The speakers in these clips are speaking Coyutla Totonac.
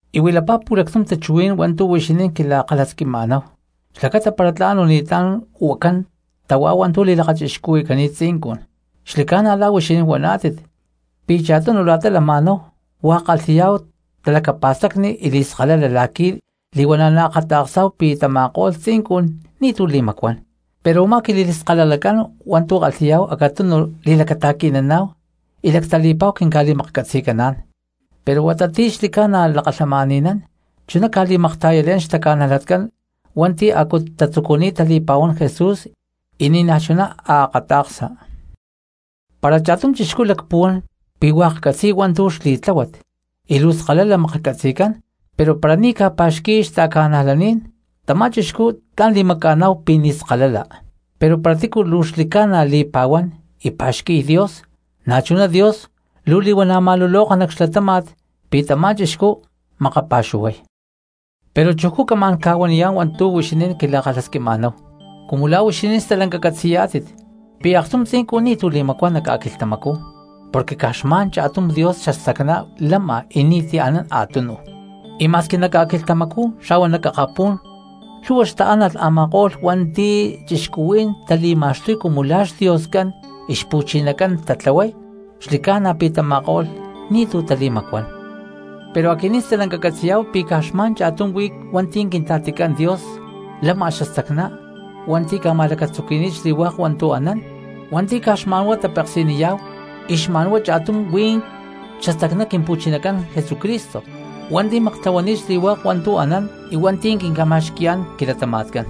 Y huilapá pu̠lactum tachuhuí̠n hua̠ntu̠ huixinín quila̠kalhasquima̠náhu xlacata para tla̠n o ni̠tlá̠n huacán tahuá hua̠ntu̠ li̠lakachixcuhui̠cani̠t tzincun. Xli̠ca̠na la̠ huixinín huaná̠tit pi̠ cha̠tunu la̠ta lama̠náhu hua̠k kalhi̠yá̠hu talacapa̠stacni y li̠skalala la̠qui̠ li̠huana̠ naakata̠ksá̠hu pi̠ tama̠ko̠lh tzincun ni̠tu̠ li̠macuán. Pero u̠má quili̠skalalacán hua̠ntu̠ kalhi̠yá̠hu acatunu li̠lacata̠qui̠naná̠hu y lactali̠pa̠hu quinca̠li̠maklhcatzi̠caná̠n, pero huata ti̠ xli̠ca̠na lakalhamani̠nán chuná ca̠li̠makta̠yale̠niy xtaca̠najlatcán hua̠nti̠ a̠cu tatzucuni̠t tali̠pa̠huán Jesús y ni̠naj chuná akata̠ksa. Para cha̠tum chixcú lacpuhuán pi̠ hua̠k catzi̠y hua̠ntu̠ xli̠tláhuat y luu skalala maklhcatzi̠cán pero para ni̠ ca̠pa̠xqui̠y xta̠ca̠najlaní̠n, tamá cristiano tla̠n li̠maca̠ná̠hu pi̠ hasta ni̠naj skalala nahuán. Pero para tícu luu xli̠ca̠na li̠pa̠huán y pa̠xqui̠y Dios, na̠chuná Dios luu li̠huana̠ ma̠luloka nac xlatáma̠t pi̠ tamá cristo makapa̠xuhuay. Pero chujcú camá̠n ca̠huaniyá̠n hua̠ntu̠ huixinín quila̠kalhasquima̠náhu. Cumu la̠ huixinín stalanca catzi̠yá̠tit pi̠ aktum tzincun ni̠tu̠ li̠macuán nac ca̠quilhtamacú porque caj xma̠n cha̠tum Dios xastacná lama y ni̠ti̠ anán a̠túnuj. Y ma̠squi nac ca̠quilhtamacú xa̠huá nac akapú̠n lhu̠hua xtaánalh a̠ma̠ko̠lh hua̠nti̠ cristianos tali̠ma̠xtuy cumu lá xdioscán y xpu̠chinacán tatlahuay, xli̠ca̠na pi̠ tama̠ko̠lh ni̠tu̠ tali̠macuán. Pero aquinín stalanca catzi̠yá̠hu pi̠ caj xma̠n cha̠tum huí hua̠nti̠ Quintla̠ticán Dios lama xastacná hua̠nti̠ ca̠ma̠lacatzuqui̠ni̠t xli̠hua̠k hua̠ntu̠ anán, hua̠nti̠ caj xma̠nhuá tapeksi̠niyá̠hu. Y xma̠nhuá cha̠tum huí xastacná Quimpu̠chinacán Jesucristo hua̠nti̠ maktlahuani̠t xli̠hua̠k hua̠ntu̠ anán y hua̠nti̠ quinca̠ma̠xqui̠yá̠n quilatama̠tcán.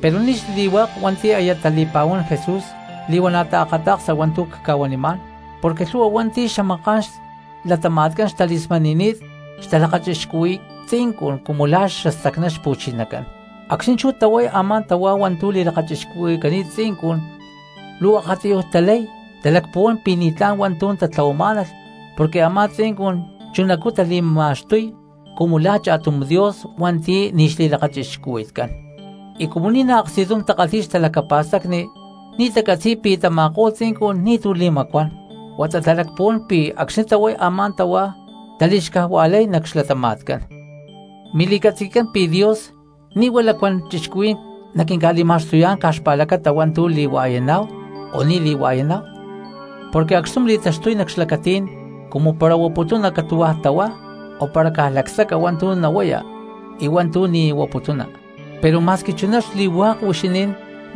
Pero ni̠ xli̠hua̠k hua̠nti̠ aya tali̠pa̠huán Jesús li̠huana̠ taakata̠ksa hua̠ntu̠ cca̠huanimá̠n, porque lhu̠hua hua̠nti̠ xamaká̠n xlatama̠tcán xtali̠smani̠ni̠t xtalakachixcuhui̠y tzincun cumu lá xastacná xpu̠chinacán. Acxni̠ chú tahuay a̠má tahuá hua̠ntu̠ li̠lakachixcuhui̠cani̠t tzincun luu akatiyuj talay talacpuhuán pi̠ ni̠tlá̠n hua̠ntu̠ tatlahuamá̠nalh porque a̠má tzincun chunacú tali̠ma̠xtuy cumu la̠ cha̠tum dios hua̠nti̠ ni̠ xli̠lakachixcuhui̠tcán. Y cumu ni̠naj aksti̠tum takalhi̠y xtalacapa̠stacni ni̠ tacatzi̠y pi̠ tama̠ko̠lh tzincun ni̠tu̠ tali̠macuán huata talacpuhuán pi̠ acxni̠ tahuay a̠má tahuá tali̠xcajua̠lay nac xlatama̠tcán. Mili̠catzi̠tcán pi̠ Dios ni̠ huá lacuán cristianos naquinca̠li̠ma̠xtuyá̠n caj xpa̠lacata hua̠ntu̠ li̠hua̠yaná̠hu o ni̠ li̠hua̠yaná̠hu, porque acxtum li̠taxtuy nac xlacatí̠n cumu para huaputuna catu̠hua̠ tahuá o para caj lacsaca hua̠ntu̠ nahuaya y hua̠ntu̠ ni̠ huaputuna. Pero ma̠squi chuná xli̠hua̠k huixinín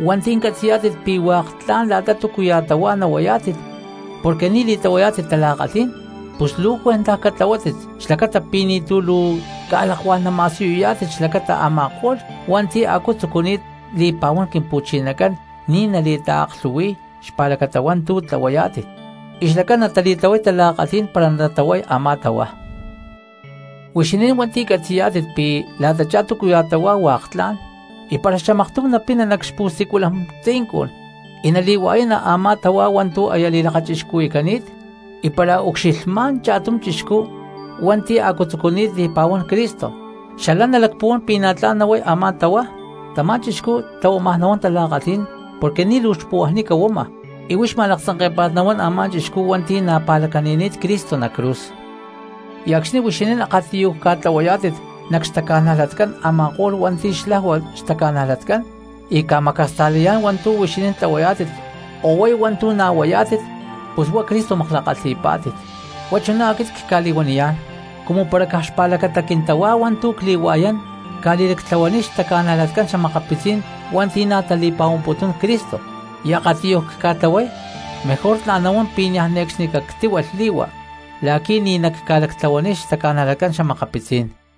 hua̠nti̠ catzi̠yá̠tit pi̠ hua̠k tla̠n la̠ta túcuya̠ tahuá nahuayá̠tit porque ni̠ li̠tlahuayá̠tit tala̠kalhí̠n, pus luu cuentaj catlahuátit xlacata pi̠ ni̠tu̠ luu ca̠lakuá̠n nama̠siyuyá̠tit xlacata a̠ma̠ko̠lh hua̠nti̠ a̠cu tzucuni̠t li̠pa̠huán Quimpu̠chinacán ni̠ nali̠taaklhu̠hui̠y xpa̠lacata hua̠ntu̠ tlahuayá̠tit y xlacán natali̠tlahuay tala̠kalhí̠n para natahuay a̠má tahuá. Huixinín hua̠nti̠ catzi̠yá̠tit pi̠ la̠tachá túcuya̠ tahuá hua̠k tla̠n, y para xamaktum napina nac xpu̠siculan tzincun y nali̠hua̠yana a̠má tahuá hua̠ntu̠ aya li̠lakachixcuhui̠cani̠t, y para ucxilhmá̠n cha̠tum cristiano hua̠nti̠ a̠cu tzucuni̠t li̠pa̠huán Cristo, xalán nalacpuhuán pi̠ na̠ tla̠n nahuay a̠má tahuá. Tamá cristiano tlahuámaj nahuán tala̠kalhí̠n porque ni̠ luu xpuhuajnica huama, y huix ma̠laktzanké̠pa̠t nahuán a̠má cristiano hua̠nti̠ na̠ pa̠lacani̠ni̠t Cristo nac cruz. Y acxni̠ huixinín akatiyuj ca̠tlahuayá̠tit nac xtaca̠najlatcán a̠ma̠ko̠lh hua̠nti̠ xlajua xtaca̠najlatcán y ca̠macasta̠layá̠n hua̠ntu̠ tlahuayá̠tit o huay hua̠ntu̠ na̠ huayá̠tit, pus huá Cristo makla̠kalhi̠pá̠tit. Huá chuná aquit cca̠li̠huaniyá̠n, cumu para caj xpa̠lacata quintahuá hua̠ntu̠ cli̠hua̠yán cca̠li̠lactlahuaniy xtaca̠najlatcán xa̠makapitzí̠n hua̠nti̠ na̠ tali̠pa̠huamputún Cristo y akatiyuj cca̠tlahuay, mejor tla̠n nahuán pi̠ niaj ne̠cxni cactíhualh li̠hua la̠qui̠ ni̠ nacca̠lactlahuahuaniy xtaca̠najlatcán xa̠makapitzí̠n cristianos.